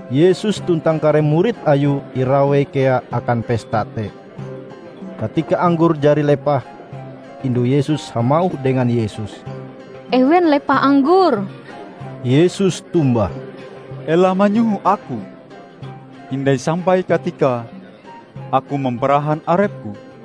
Yesus tuntang kare murid Ayue irawei kea akan pesta te. Katika anggor jari lepah, indu Yesus hamauh dengan Yesus, "Ewen lepah anggor." Yesus tombah, "Ela manyoho Aku. Hindai sampai katikae Aku mamparahan arep-Ku."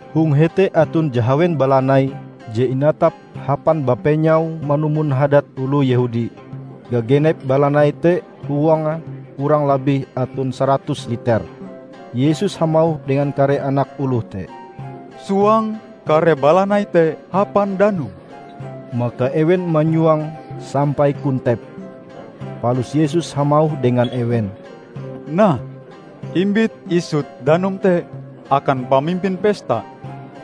Hong hete aton jahawen balanai je inatap hapan bapenyau manumon hadat oloh Yehudi. Gagenep balanai te huange kurang labih aton saratus liter. Yesus hamauh dengan kare anak oloh te, "Suang kare balanai te hapan danum." Maka ewen manyuange sampai kontep. Palus Yesus hamauh dengan ewen, "Nah, imbit isut danum te akan pamimpin pesta."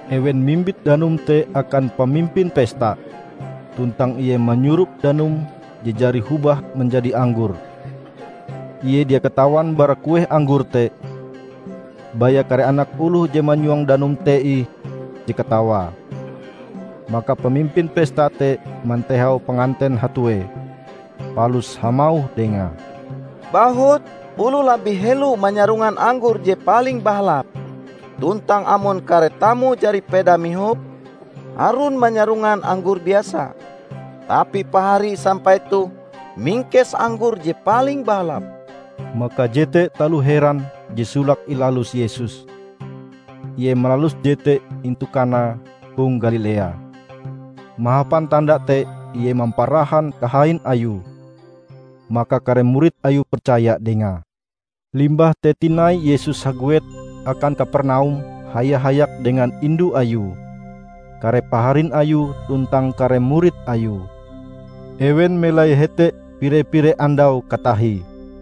Ewen mimbit danum te akan pamimpin pesta, tuntang ie manyurop danum je jari hobah manjadi anggor. (Ie dia katawan bara kueh anggor te, baya kare anak oloh je manyuang danum te ih je katawae.) Maka pamimpin pesta te mantehau panganten hatue, palus hamauh dengae, "Bahut, oloh labih helo manyarongan anggor je paling bahalap tuntang amon kare tamu jari peda mihop, harun manyarongan anggor biasa. Tapi pahari sampai toh mingkes anggor je paling bahalap!" Maka jete taloh heran je solake ilalus Yesus. Ie malalus jete intu Kana hong Galilea. Mahapan tanda te Ie mamparahan kahain Ayue. Maka kare murid Ayue percaya Dengae. Limbah te tinai Yesus haguet akan Kapernaum haya-hayak dengan indu Ayue, kare paharin Ayue tuntang kare murid Ayue. Ewen melai hete pire-pire andau katahie.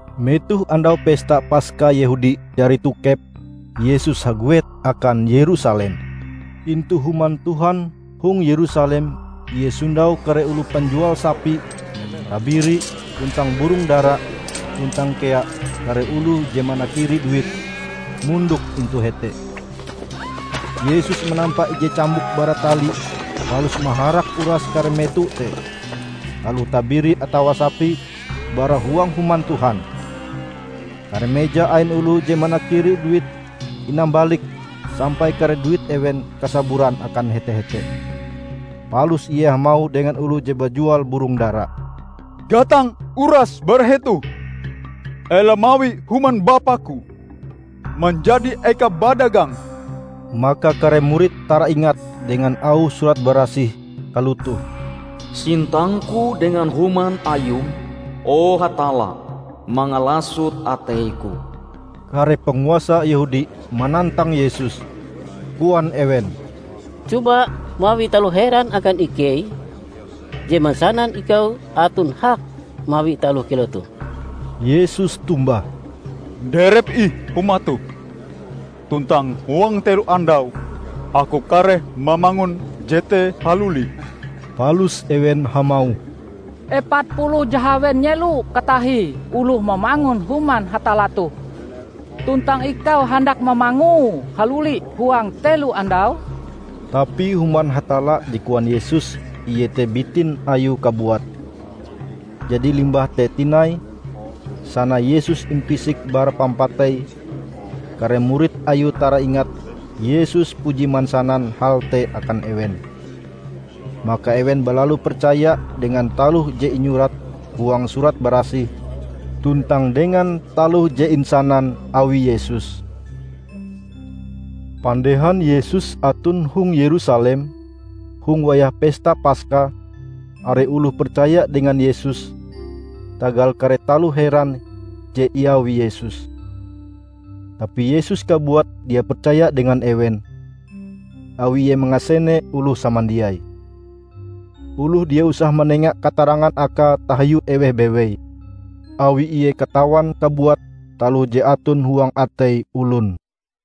Metoh Andau Pesta Paska Yehudi jari tokep, Yesus haguet akan Yerusalem. Intu Human Tuhan hong Yerusalem Ie sondau kare oloh panjual sapi, tabiri, tuntang burong dara; tuntang kea kare oloh je manakiri duit, mondok intu hete. Yesus manampa ije cambuk bara tali palus maharak uras kare meto te, aloh tabiri atawa sapi, bara huang Human Tuhan. Kare meja ain oloh je manakiri duit inambalike sampai kare duit ewen kasaburan akan hete-hete. Palus Ie hamauh dengan oloh je bajual burong dara, "Gatang urase bara hetoh. Ela mawi Human Bapa-Ku manjadi eka badagang!" Maka kare murid taraingat dengan auh Surat Barasih kalotoh, "Sintang-Ku dengan Human Ayum, o Hatalla, mangalasot atei-Ku." Kare panguasa Yehudi manantang Yesus, koan ewen, "Coba mawi taloh heran akan ikei, je mansanan ikau aton hak mawi taloh kilau toh." Yesus tombah, "Nderep ih Huma toh, tuntang huang telo andau Aku kareh mamangun jete haluli." Palus ewen hamauh, "Epat puluh jahawen nyelo katahie oloh mamangun Human Hatalla toh. Tuntang ikau handak mamangue haluli huang telo andau?" Tapi Human Hatalla je koan Yesus iete bitin Ayue kabuat. Jadi limbah te tinai, sana Yesus impisik bara pampatei kare murid Ayue taraingat Yesus puji mansanan hal te akan ewen. Maka ewen balalu percaya dengan taloh je inyurat huang Surat Barasih tuntang dengan taloh je insanan awi Yesus. Pandehan Yesus aton hong Yerusalem, hong wayah Pesta Paska, are oloh percaya dengan Yesus tagal kare taloh heran je iawi Yesus. Tapi Yesus kabuat dia percaya dengan ewen, awi Ie mangasene oloh samandiai. Oloh dia usah manenga katarangan Akae tahiu eweh bewei, awi Ie katawan kabuat taloh je aton huang atei olon.